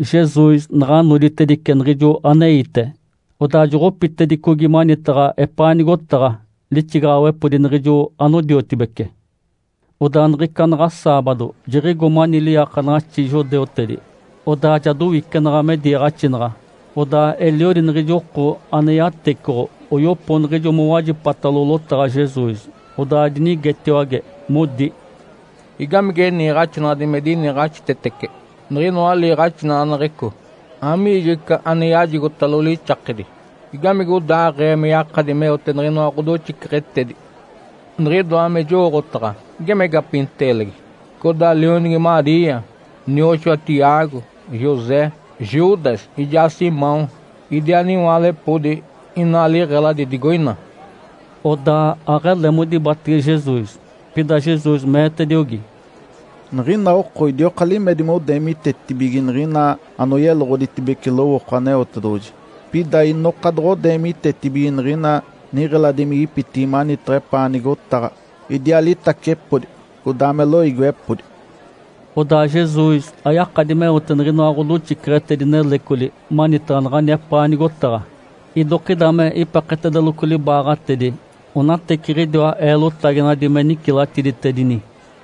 Jesus naɡ̶a noditedice niɡ̶ijo aneite, odaa joɡ̶opitedicogi manitaɡ̶a epaa nigotaɡ̶a lixigaɡ̶awepodi niɡ̶ijo anodiotibece. Odaa niɡ̶ica naɡ̶a saabado, jiɡ̶igo mani liiakanaɡ̶axi judeutedi, odaa ja dowicenaɡ̶a me diiɡ̶axinaɡ̶a. Odaa eliodi niɡ̶ijo oko ane yatecoɡ̶o oyopo niɡ̶ijo noɡ̶owajipatalo lotaɡ̶a Jesus, odaa dinigetiwage, modi, “Igamige niiɡ̶axinaɡ̶adi me diniiɡ̶axitetece niɡ̶inoa liiɡ̶axinaɡ̶aneɡ̶eco? Amigijo ica ane yajigotalo lixakedi? Igamigodaaɡ̶ee me yakadi meote niɡ̶inoa ɡ̶odoxiceɡ̶etedi? Niɡ̶idoa me jowooɡ̶otaɡ̶a geme gapinteelegi, codaa lionigi Maria, nioxoa Tiago, José, Judas ijaa Simão. Idiaa niwaalepodi inaa liɡ̶eladi digoina.” Odaa aɡ̶ele modibatege Jesus. Pida Jesus meetediogi, “Niɡ̶ina oko idioka limedi modeemitetibige niɡ̶ina anoyeloɡ̶oditedibece lowooko Aneotedoɡ̶oji. Pida inoka doɡ̶odeemitetibige niɡ̶ina niɡ̶eladimigipitigi manitaɡ̶a epaa nigotaɡ̶a, idiaa litacepodi, codaa me loiigiwepodi.” Odaa Jesus ayakadi meote niɡ̶inoa ɡ̶odoxiceɡ̶etedi nelecoli manitaɡ̶a naɡ̶ani epaa nigotaɡ̶a. Idokida me ipeketedeloco libaaɡ̶atedi onateciɡ̶idiwa eelotaginadi me nicilatiditedini.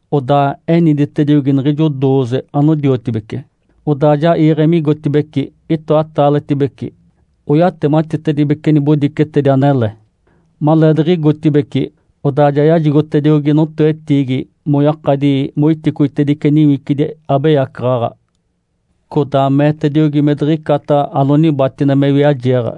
Odaa eniditediogi niɡ̶ijo dooze anodiotibece, odaa ja iiɡ̶e migotibeci itoataaletibece oyatematitedibece nibodicetedi anele. Maleediɡ̶igotibeci, odaa ja yajigotediogi notoetiigi moyakadi moiticoitedice niwicidi abeyacaɡ̶aɡ̶a. Codaa meetediogi me diɡ̶icata anonibatine me wiajeeɡ̶a.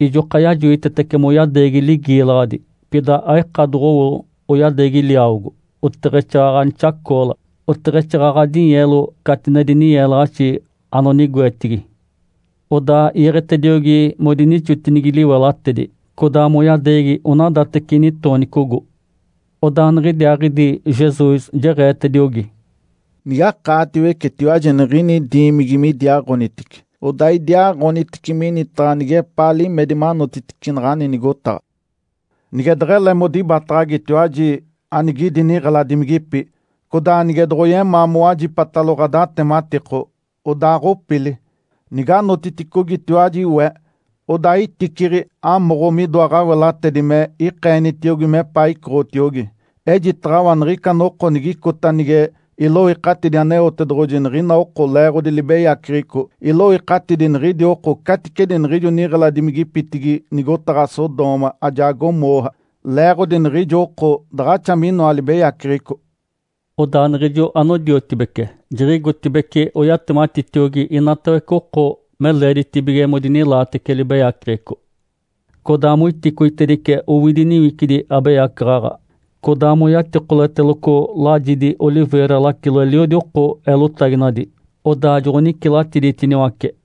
Ijoka yajoitetece moyadeegi ligiilaɡ̶adi. Pida aika doɡ̶owo oyadeegi liawogo, oteɡ̶exaaɡ̶aɡ̶a nixacoola, oteɡ̶exaaɡ̶aɡ̶a dinyeelo catinedi ninyeelaɡ̶axi anonigoetigi. Odaa iiɡ̶etediogi modinixotinigi liwelatedi, codaa moyadeegi onadateci nitoonicogo. Odaa niɡ̶idiaaɡ̶idi Jesus jeɡ̶eetediogi, “Nigakaatiwecetiwaji anigini diimigi me idiaaɡ̶onitice, odaa idiaaɡ̶onitice minitaɡ̶a nigepaa limedi manotitice naɡ̶ani nigotaɡ̶a. Nige deɡ̶ele modibataɡ̶agitiwaji anigidi niɡ̶eladimigipi, codaa nige doɡ̶oyemaa mowajipatalo ɡ̶adatematiko, odaaɡ̶opili. Niganotiticogitiwaji we, odaa iticiɡ̶i amoɡ̶o midoa ɡ̶awelatedi me ikeenitiogi mepaa icoɡ̶otiogi. Ejitaɡ̶awa niɡ̶ica noko nigicota nige iloikatidi Aneotedoɡ̶oji niɡ̶ina oko leeɡ̶odi libeyaceɡ̶eco, iloikatidi niɡ̶idi oko caticedi niɡ̶ijo niɡ̶eladimigipitigi nigotaɡ̶a Sodoma ajaa Gomorra leeɡ̶odi niɡ̶ijo oko daɡ̶axa minoa libeyaceɡ̶eco.” Odaa niɡ̶ijo anodiotibece jiɡ̶igotibeci, oyatematitiogi inatawece oko me leeditibige modinilaatece libeyaceɡ̶eco. Codaa moiticoitedice owidi niwicidi abeyacaɡ̶aɡ̶a. Codaa moyatikoleteloco lajidi oliveira lacilo eliodi oko eelotaginadi, odaa joɡ̶onicilatiditiniwace.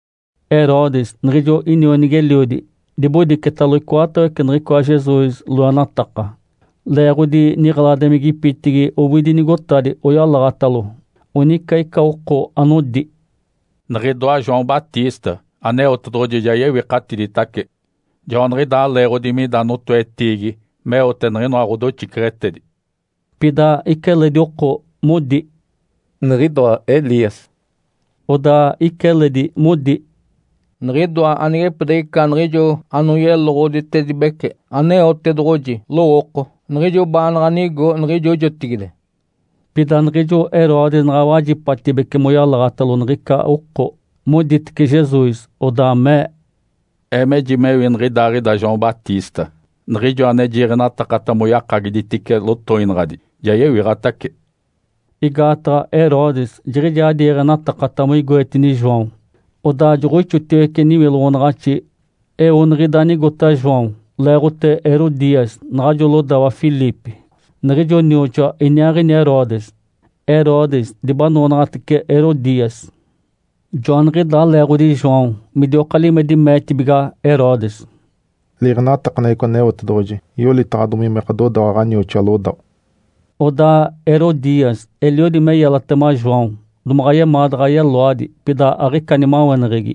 Herodes niɡ̶ijo inionigi-eliodi dibodicetalo icoatawece niɡ̶icoa Jesus loenataka, leeɡ̶odi niɡ̶eladimigipitigi owidi nigotadi oyalaɡ̶atalo. Onica ica oko anodi, “Niɡ̶idoa João Batista Aneotedoɡ̶oji ja yewikatiditace. Joaniɡ̶idaa leeɡ̶odi mida notoetiigi meote niɡ̶inoa ɡ̶odoxiceɡ̶etedi.” Pida ica eledi oko modi, “Niɡ̶idoa Elias.” Odaa ica eledi modi, “Niɡ̶idoa anigepidiɡ̶ica niɡ̶ijo anoyeloɡ̶oditedibece Aneotedoɡ̶oji lowooko, niɡ̶ijo baanaɡ̶a nigo niɡ̶ijo jotigide!” Pida niɡ̶ijo Herodes naɡ̶a wajipatibece moyalaɡ̶atalo niɡ̶ica oko, moditece Jesus, odaa mee, “Ee mejimewi niɡ̶idaaɡ̶ida João Batista, niɡ̶ijo ane jiiɡ̶enatakata moyakagiditice lotoinaɡ̶adi. Ja yewiɡ̶atace!” Igaataɡ̶a Herodes jiɡ̶ijaa diiɡ̶enatakata moigoetini João, odaa joɡ̶oixotiwece niwiloɡ̶onaɡ̶axi. Eo niɡ̶ida anigota João leeɡ̶ote Herodias, naɡ̶ajo lodawa Filipe, niɡ̶ijo nioxoa iniaaɡ̶ini Herodes. Herodes dibanoonaɡ̶atece Herodias. Joaniɡ̶idaa leeɡ̶odi João midioka limedi meetibiga Herodes, “Liiɡ̶enatakaneɡ̶eco Aneotedoɡ̶oji yolitaɡ̶adomi me ɡ̶adodawa ɡ̶anioxoa lodawa.” Odaa Herodias eliodi me yelatema João, domaɡ̶a yemaa daɡ̶a yeloadi. Pida aɡ̶ica nimaweneɡ̶egi.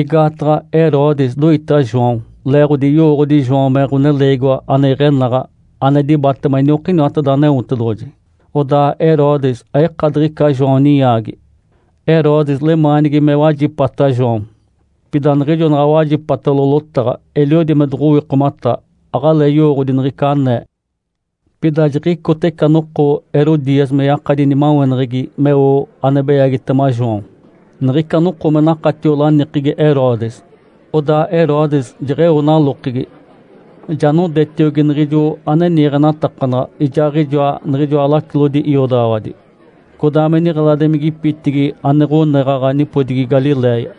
Igaataɡ̶a Herodes doita João, leeɡ̶odi yowooɡ̶odi João me ɡ̶oneleegiwa ane iɡ̶enaɡ̶a ane dibatema iniokiniwateda Aneotedoɡ̶oji. Odaa Herodes aika diɡ̶ica João ninyaagi. Herodes lemaanigi me wajipata João, pida niɡ̶ijo naɡ̶a wajipatalo lotaɡ̶a, eliodi me doɡ̶owikomata, aɡ̶alee yowooɡ̶odi niɡ̶ica anee. Pida jiɡ̶icota ica noko Herodias me yakadi nimaweneɡ̶egi meo ane beyagitema João. Niɡ̶ica noko me nakatio lanikegi Herodes. Odaa Herodes jeɡ̶eo nalokegi, ja nodetiogi niɡ̶ijo ane niiɡ̶enatakanaɡ̶a ijaaɡ̶ijoa niɡ̶ijoa lacilodi iodaɡ̶awadi codaa me niɡ̶eladimigipitigi ane ɡ̶oneɡ̶aɡ̶a nipodigi Galiléia.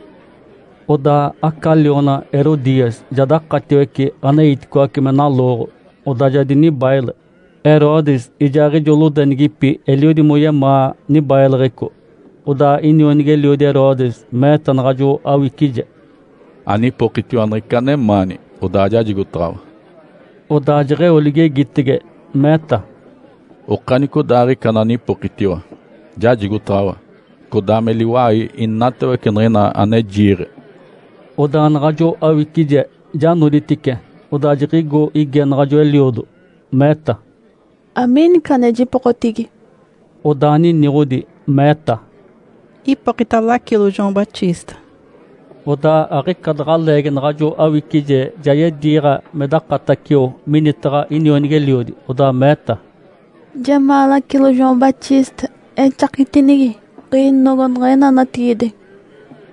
Odaa aca liona Herodias ja dakatiwece aneiticoace me nalooɡ̶o, odaa ja dinibaile. Herodes ijaaɡ̶ijo lodenigipi eliodi moyemaa nibaileɡ̶eco. Odaa inionigi-eliodi Herodes meeta naɡ̶ajo awicije, “Anipokitiwa niɡ̶ica anemaani, odaa jajigotaɡ̶awa.” Odaa jeɡ̶eo ligegitege, meeta, “Okanicodaaɡ̶ica ananipokitiwa, jajigotaɡ̶awa, codaa me liwai inatawece niɡ̶ina ane jiiɡ̶e.” Odaa naɡ̶ajo awicije ja noditice, odaa jiɡ̶igo ige naɡ̶ajo eliodo, meeta, “Amiini ica ane jipokotigi?” Odaa niniɡ̶odi, meeta, “Ipokita lacilo João Batista.” Odaa aɡ̶ica daɡ̶a leegi naɡ̶ajo awicije ja yediiɡ̶a me dakatacio minitaɡ̶a inionigi-eliodi, odaa meeta, “Jemaa lacilo João Batista exakitinigi ɡ̶inogo niɡ̶ina natigide.”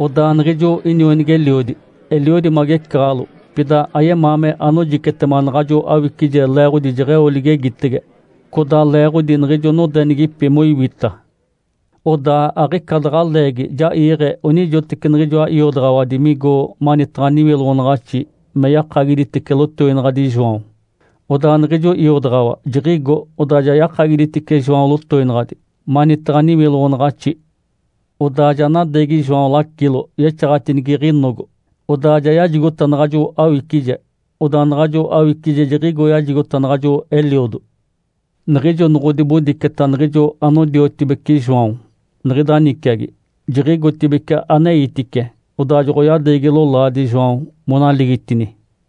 Odaa niɡ̶ijo inionigi-eliodi eliodi magecaɡ̶alo. Pida ayemaa me anojicetema naɡ̶ajo awicije leeɡ̶odi jeɡ̶eo ligegitege, codaa leeɡ̶odi niɡ̶ijo nodenigipi moiwita. Odaa aɡ̶ica daɡ̶a leegi ja iiɡ̶e onijoteci niɡ̶ijoa iodaɡ̶awadi migo manitaɡ̶a niwiloɡ̶onaɡ̶axi me yakagiditice lotoinaɡ̶adi João. Odaa niɡ̶ijo iodaɡ̶awa jiɡ̶igo, odaa ja yakagiditice João lotoinaɡ̶adi manitaɡ̶a niwiloɡ̶onaɡ̶axi. Odaa ja nadeegi João lacilo yexaɡ̶atinigi ɡ̶inogo, odaa ja yajigota naɡ̶ajo awicije. Odaa naɡ̶ajo awicije jiɡ̶igo yajigota naɡ̶ajo eliodo. Niɡ̶ijo noɡ̶odibodiceta niɡ̶ijo anodiotibeci João niɡ̶ida niciagi, jiɡ̶igotibeci aneitice, odaa joɡ̶oyadeegi lolaadi João, monaligitini.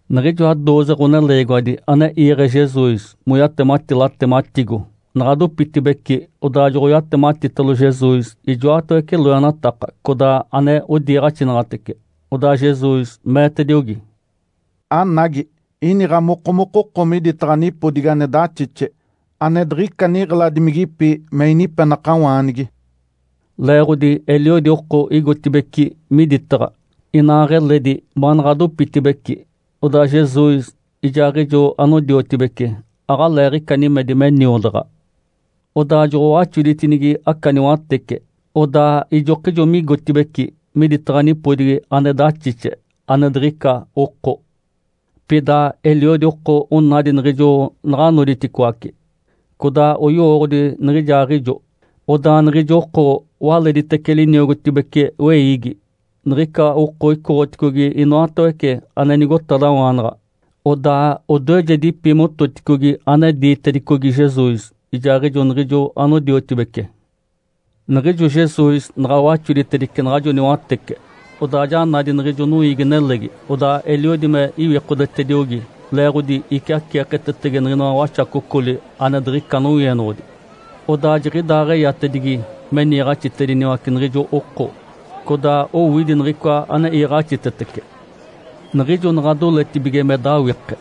Niɡ̶ijoa dooze ɡ̶oneleegiwadi ane iiɡ̶e Jesus moyatemati latematigo naɡ̶a dopitibeci, odaa joɡ̶oyatematitalo Jesus ijoatawece loenataka codaa ane odiiɡ̶axinaɡ̶atece. Odaa Jesus meetediogi, “Anagi! Iniɡ̶a mokomokoko miditaɡ̶a nipodigi ane daxixe ane diɡ̶ica niɡ̶eladimigipi me inipenakawaanigi.” Leeɡ̶odi eliodi oko igotibeci miditaɡ̶a, inaaɡ̶eledi baanaɡ̶a dopitibeci, odaa Jesus ijaaɡ̶ijo anodiotibece aɡ̶aleeɡ̶ica nimedi me niodaɡ̶a. Odaa joɡ̶owaxoditinigi aca niwatece, odaa ijokijo migotibeci miditaɡ̶a nipodigi ane daxixe, ane diɡ̶ica oko. Pida eliodi oko onadi niɡ̶ijo naɡ̶a noditicoaci, codaa oyowooɡ̶odi niɡ̶ijaaɡ̶ijo. Odaa niɡ̶ijo oko waleditece liniogotibece weiigi. Niɡ̶ica oko oicoɡ̶oticogi inoatawece ane nigotadawaanaɡ̶a, odaa odoejedipi mototicogi ane diitedicogi Jesus ijaaɡ̶ijo niɡ̶ijo anodiotibece. Niɡ̶ijo Jesus naɡ̶a waxoditedice naɡ̶ajo niwatece, odaa ja nadi niɡ̶ijo noiigi-nelegi. Odaa eliodi me iwikodetediogi, leeɡ̶odi iciaceeketetege niɡ̶inoa waxacocoli ane diɡ̶ica nowienoɡ̶odi. Odaa jiɡ̶idaaɡ̶eyatedigi me niiɡ̶axitediniwace niɡ̶ijo oko, codaa owidi niɡ̶icoa ane iiɡ̶axitetece. Niɡ̶ijo naɡ̶a doletibige me dawike,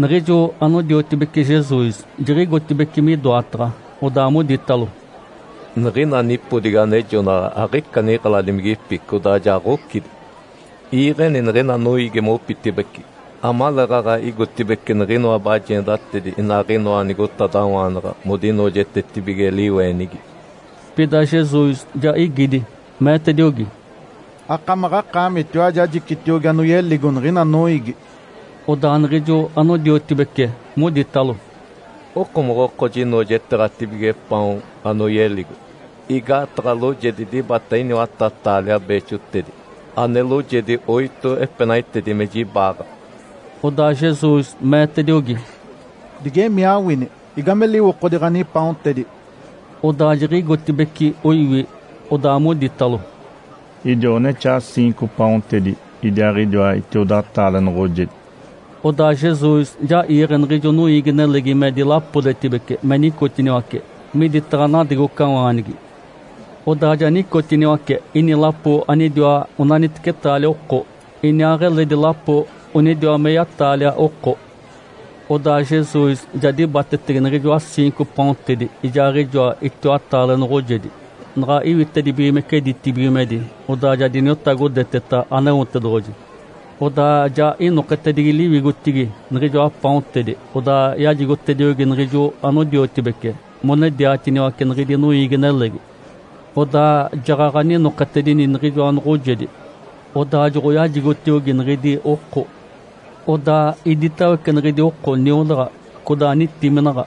niɡ̶ijo anodiotibece Jesus jiɡ̶igotibeci midoataɡ̶a, odaa moditalo, “Niɡ̶ina nipodigi anejonaɡ̶a aɡ̶ica niɡ̶eladimigipi codaa ja ɡ̶ocidi. Iiɡ̶eni niɡ̶ina noiigi mopitibeci, amaleeɡ̶aɡ̶a igotibeci niɡ̶inoa bajeendatedi inaaɡ̶inoa nigotadawaanaɡ̶a modinoojetetibige liweenigi.” Pida Jesus ja igidi, meetediogi, “Akamaɡ̶akaamitiwaji ajicitiogi anoyeligo niɡ̶ina noiigi!” Odaa niɡ̶ijo anodiotibece moditalo, “Okomoɡ̶oko jinoojeteeɡ̶atibige paon anoyeligo? Igaataɡ̶a loojedi dibata iniwata-taalia beexotedi, ane loojedi oito epenaitedi me jibaaɡ̶a!” Odaa Jesus meetediogi, “Digemii awini! Igame liwokodi ɡ̶anipaontedi?” Odaa jiɡ̶igotibeci oiwi, odaa moditalo, “Idiwa onexaa ciinco paontedi idiaaɡ̶idiwa itiodataale noɡ̶ojedi.” Odaa Jesus ja iiɡ̶e niɡ̶ijo noiigi-nelegi me dilapodetibece me nicotiniwace miditaɡ̶a nadegocawaanigi. Odaa ja nicotiniwace ini lapo anidiwa onaniteci taalia oko, iniaaɡ̶eledi lapo onidiwa meya-taalia oko. Odaa Jesus ja dibatetege niɡ̶ijoa ciinco paontedi ijaaɡ̶ijoa itiwataale noɡ̶ojedi, naɡ̶a iwitedibigimece ditibigimedi, odaa ja diniotagodeteta Aneotedoɡ̶oji. Odaa ja inoketedigi liwigotigi niɡ̶ijoa paontedi, odaa yajigotediogi niɡ̶ijo anodiotibece monediatiniwace niɡ̶idi noiigi-nelegi. Odaa jaɡ̶aɡ̶a ninoketedini niɡ̶ijoa noɡ̶ojedi, odaa joɡ̶oyajigotiogi niɡ̶idi oko. Odaa iditawece niɡ̶idi oko niodaɡ̶a, codaa nitiminaɡ̶a.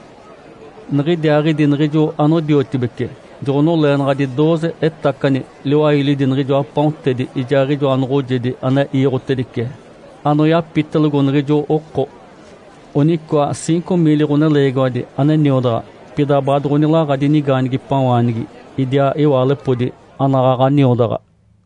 Niɡ̶idiaaɡ̶idi niɡ̶ijo anodiotibece joɡ̶onoleenaɡ̶adi dooze etacani liwailidi niɡ̶ijoa paontedi ijaaɡ̶ijoa noɡ̶ojedi ane iiɡ̶otedice anoyapitelogo niɡ̶ijo oko. Onicoa ciinco miili ɡ̶oneleegiwadi ane niodaɡ̶a, pida baadoɡ̶onilaɡ̶adi nigaanigipawaanigi idiaa iwaalepodi anaɡ̶aɡ̶a niodaɡ̶a.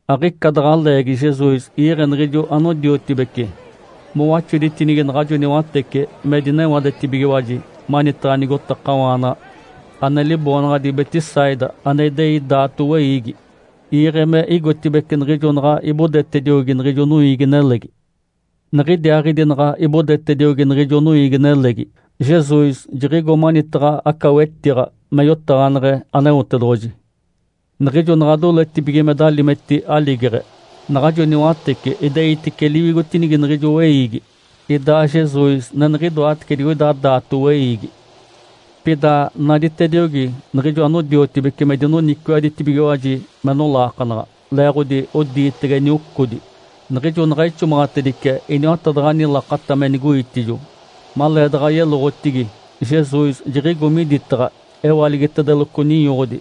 Aɡ̶ica daɡ̶a leegi Jesus iiɡ̶e niɡ̶ijo anodiotibece mowaxoditinigi naɡ̶ajo niwatece me dinewadetibigiwaji manitaɡ̶a nigotakawaana ane liboonaɡ̶adi Betsaida ane idei daato weiigi. Iiɡ̶e me igotibeci, niɡ̶ijo naɡ̶a ibodetediogi niɡ̶ijo noiigi-nelegi. Niɡ̶idiaaɡ̶idi naɡ̶a ibodetediogi niɡ̶ijo noiigi-nelegi, Jesus jiɡ̶igo manitaɡ̶a aca wetiɡ̶a me yotaɡ̶aneɡ̶e Aneotedoɡ̶oji. Niɡ̶ijo naɡ̶a doletibige me dalimeti aligeɡ̶e, naɡ̶ajo niwatece ideitice liwigotinigi niɡ̶ijo weiigi, idaa Jesus neniɡ̶idoatece digoida daato weiigi. Pida naditediogi niɡ̶ijo anodiotibece me dinoniciwaɡ̶aditibigiwaji me nolaakanaɡ̶a, leeɡ̶odi odiitege niocodi. Niɡ̶ijo naɡ̶a ixomaɡ̶atedice iniwatadaɡ̶ani lakata me nigoitijo, maleedaɡ̶a yeloɡ̶otigi, Jesus jiɡ̶igo miditaɡ̶a. Ewaligitedeloco ninyoɡ̶odi,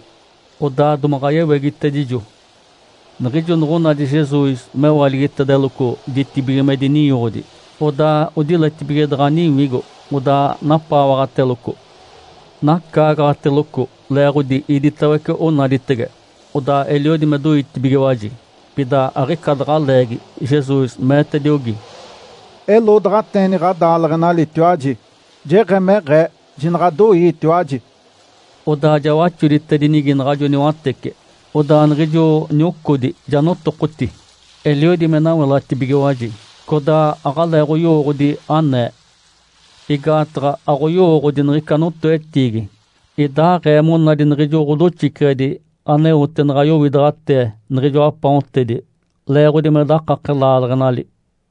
odaa domaɡ̶a yewegitedijo. Niɡ̶ijo noɡ̶onadi Jesus mewaligitedeloco ditibigimedi ninyoɡ̶odi, odaa odiletibige daɡ̶a niwigo, odaa napaawaɡ̶ateloco. Nacaagaɡ̶ateloco leeɡ̶odi iditawece onaditege, odaa eliodi me doitibigiwaji. Pida aɡ̶ica daɡ̶a leegi Jesus meetediogi, “Eloodaɡ̶ateeni ɡ̶adaaleɡ̶enalitiwaji! Jeɡ̶emeɡ̶ee! Jinaɡ̶adoiitiwaji!” Odaa ja waxoditedinigi naɡ̶ajo niwatece, odaa niɡ̶ijo niocodi ja notokoti. Eliodi me nawelatibigiwaji, codaa aɡ̶aleeɡ̶oyowooɡ̶odi anee. Igaataɡ̶a aɡ̶oyowooɡ̶odi niɡ̶ica notoetiigi, idaaɡ̶ee monadi niɡ̶ijo ɡ̶odoxiceɡ̶edi aneote naɡ̶a yowidaɡ̶atee niɡ̶ijoa paontedi, leeɡ̶odi me dakake laaleɡ̶enali.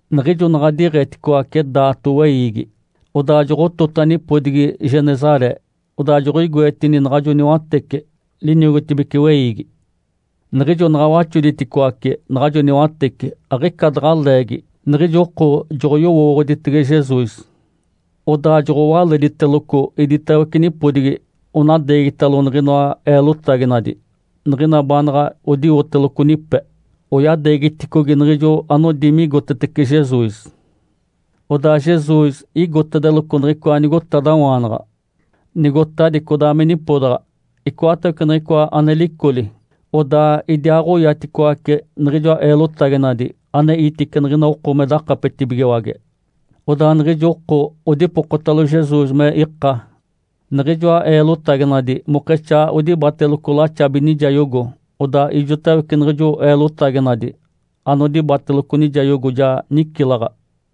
Niɡ̶ijo naɡ̶a diɡ̶etitacicoace daato weiigi, odaa joɡ̶otota nipodigi Genesaré, odaa joɡ̶oigoetini naɡ̶ajo niwatece liniogotibece weiigi. Niɡ̶ijo naɡ̶a waxoditicoace naɡ̶ajo niwatece, aɡ̶ica daɡ̶a leegi, niɡ̶ijo oko joɡ̶oyowooɡ̶oditege Jesus. Odaa joɡ̶owalediteloco iditawece nipodigi, onadeegitalo niɡ̶inoa eelotaginadi, niɡ̶ina baanaɡ̶a odiwoteloco nipe. Oyadeegiticogi niɡ̶ijo anodi migotetece Jesus. Odaa Jesus igotetedeloco niɡ̶icoa nigotadawaanaɡ̶a, nigotadi codaa me nipodaɡ̶a. Icoatawece niɡ̶icoa ane licoli, odaa idiaaɡ̶oyaticoace niɡ̶ijoa eelotaginadi aneitice niɡ̶ina oko me dakapetibigiwage, odaa niɡ̶ijo oko odipokotalo Jesus me ika niɡ̶ijoa eelotaginadi mokexaa odibateloco laxabi nijayogo. Odaa ijotawece niɡ̶ijo eelotaginadi anodibateloco nijayogo ja nicilaɡ̶a.